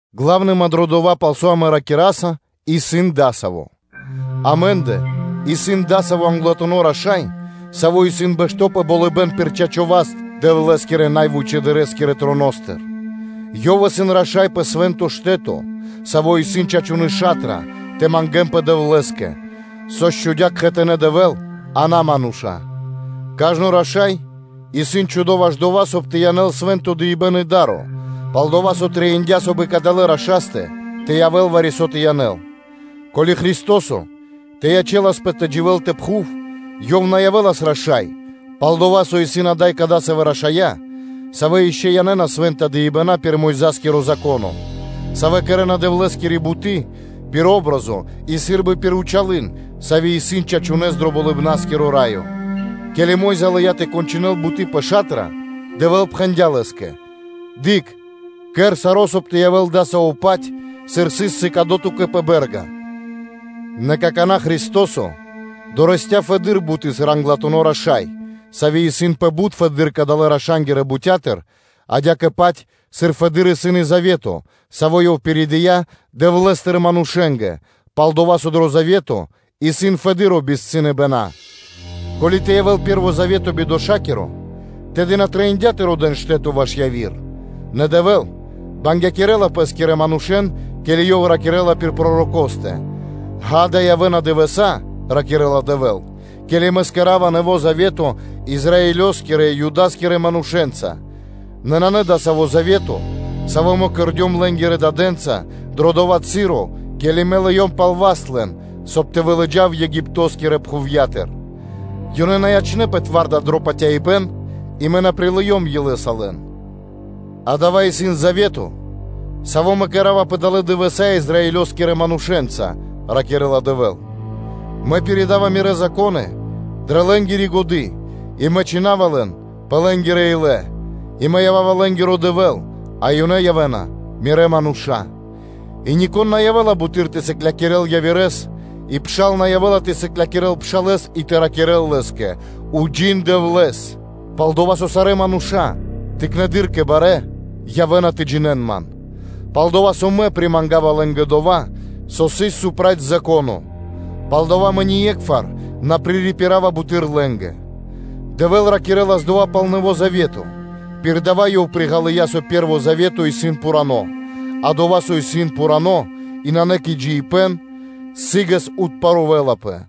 Гла́вныма исын дро дова́, пал со амэ ракираса, исын дасави́: амэ́ндэ исын адасаво́ Англатуно́ Раша́й, Саво́ исын бэшто́ пэ болыбэ́н пир чачо́ васт Дэвлэ́скирэ най вычэдырэ́скирэ троностыр; Ёв исын Раша́й пэ Свэ́нто Штэ́то, сави́ исын чачуны́ ша́тра тэ мангэ́нпэ Дэвлэ́скэ, сави́ счхудя кхэтанэ́ Дэвэ́л, а на мануша́. Кажно раша́й исын чхудо ваш дова́, соб (кай) тэ янэл свэ́нто дыибэ́н и да́ро, пал-дова́ со трэиндя́, соб (кай) и кадалэ́ Рашастэ тэ явэ́л вари-со тэ янэл. Ко́ли Христо́со тэ ячэласпэ тэ дживэ́л пэ пхув, Ёв на явэ́лас Раша́са, пал-дова́ со исын ада́й кадасавэ́ рашая́, савэ́ ишчо (инкэ́) янэ́на свэ́нта дыибэна́ пир Мойза́скиро Зако́но; савэ́ кэрэ́на Дэвлэ́скири буты́ пир патри́н (о́бразо) и сы́рбы пир зэр (тенё), савэ́ исын чачунэ́с дро Болыбна́скиро Раё. Ке́ли Мо́йза лыя́ тэ кончынэл буты́ пэ ша́тра, то Дэвэ́л пхэндя́ лэ́скэ: “Дыкх, кэр саро́, соб (кай) тэ явэ́л дасаво-паць, сыр сыс сыкадо ту́кэ пэ бэ́рга.” Нэ какана́ Христо́со дорэсця́ фэдэды́р буты́ сыр Англатуно́ Раша́й, сави́ исын пэ бут фэдэды́р кадалэ́-раша́нгирэ бутя́тыр, адя́кэ-паць, сыр фэды́р исын и Завето, саво́ Ёв пиридыя Дэвлэ́стыр манушэ́нгэ, сыр Машкиратуно, пал-дова́ со дро Завето исын фэды́р дынэ́ дава́. Ко́ли тэ явэ́л пэ́рво завето бидошакиро, тэды на трэиндя́ тэ родэ́н штэ́то ваш яви́р. Нэ Дэвэ́л бангякирэла Пэ́скирэ манушэ́н, ке́ли Ёв ракирэ́ла пир пророкостэ: “Ѓа́да, явэ́на дывэса́”, – ракирэ́ла Дэвэ́л, – “ке́ли Мэ кэра́ва Нэво́ Завето Израилёскирэ и Юда́скирэ манушэ́нца; нэ нанэ дасаво завето, саво́ Мэ кэрдём лэ́нгирэ дадэ́нца дро дова́ часо, ке́ли Мэ лыём пал васт лэн, соб (кай) тэ вылыджав Египто́скирэ пхувья́тыр. Ёнэ на ячнэ́пэ зоралэ́ дро патяибэ́н и Мэ на прилыём илэ́са лэн. Адава́ исын Завето, саво́ Мэ кэра́ва пэ далэ́ дывэса́ Израилёскирэ манушэ́нца, – ракирэ́ла Дэвэ́л. ‘Мэ пиридава Мирэ́ Зако́ны дрэ лэ́нгири годы́ и Мэ чхина́ва лэн пэ лэ́нгирэ илэ, и Мэ ява́ва лэ́нгиро Дэвэ́л, а ёнэ явэ́на Мирэ́ мануша́. И нико́н на явэ́ла буты́р тэ сыклякирэ́л явирэ́с и пшал на явэ́ла тэ сыклякирэ́л пшалэ́с и тэ ракирэ́л лэ́скэ: “Уджин Дэвлэ́с”, пал-дова́ со сарэ́ мануша́ тыкнэндыр кэ барэ́, явэ́на тэ джинэ́н Ман. Пал-дова́ со Мэ примангава лэ́нгэ дова́, со ёнэ сыс проти Зако́но, палдава́ Мэ ние́кхвар на пририпирава буты́р лэ́нгэ.” Дэвэ́л ракирэ́лас дова́ пал Нэво́ Завето, пир дава́ Ёв приґалыя со пэ́рво завето исын пхурано́. А дова́, со исын пхурано́ и нанэ кэ джиибэ́н, сы́гэс отпарувэлапэ.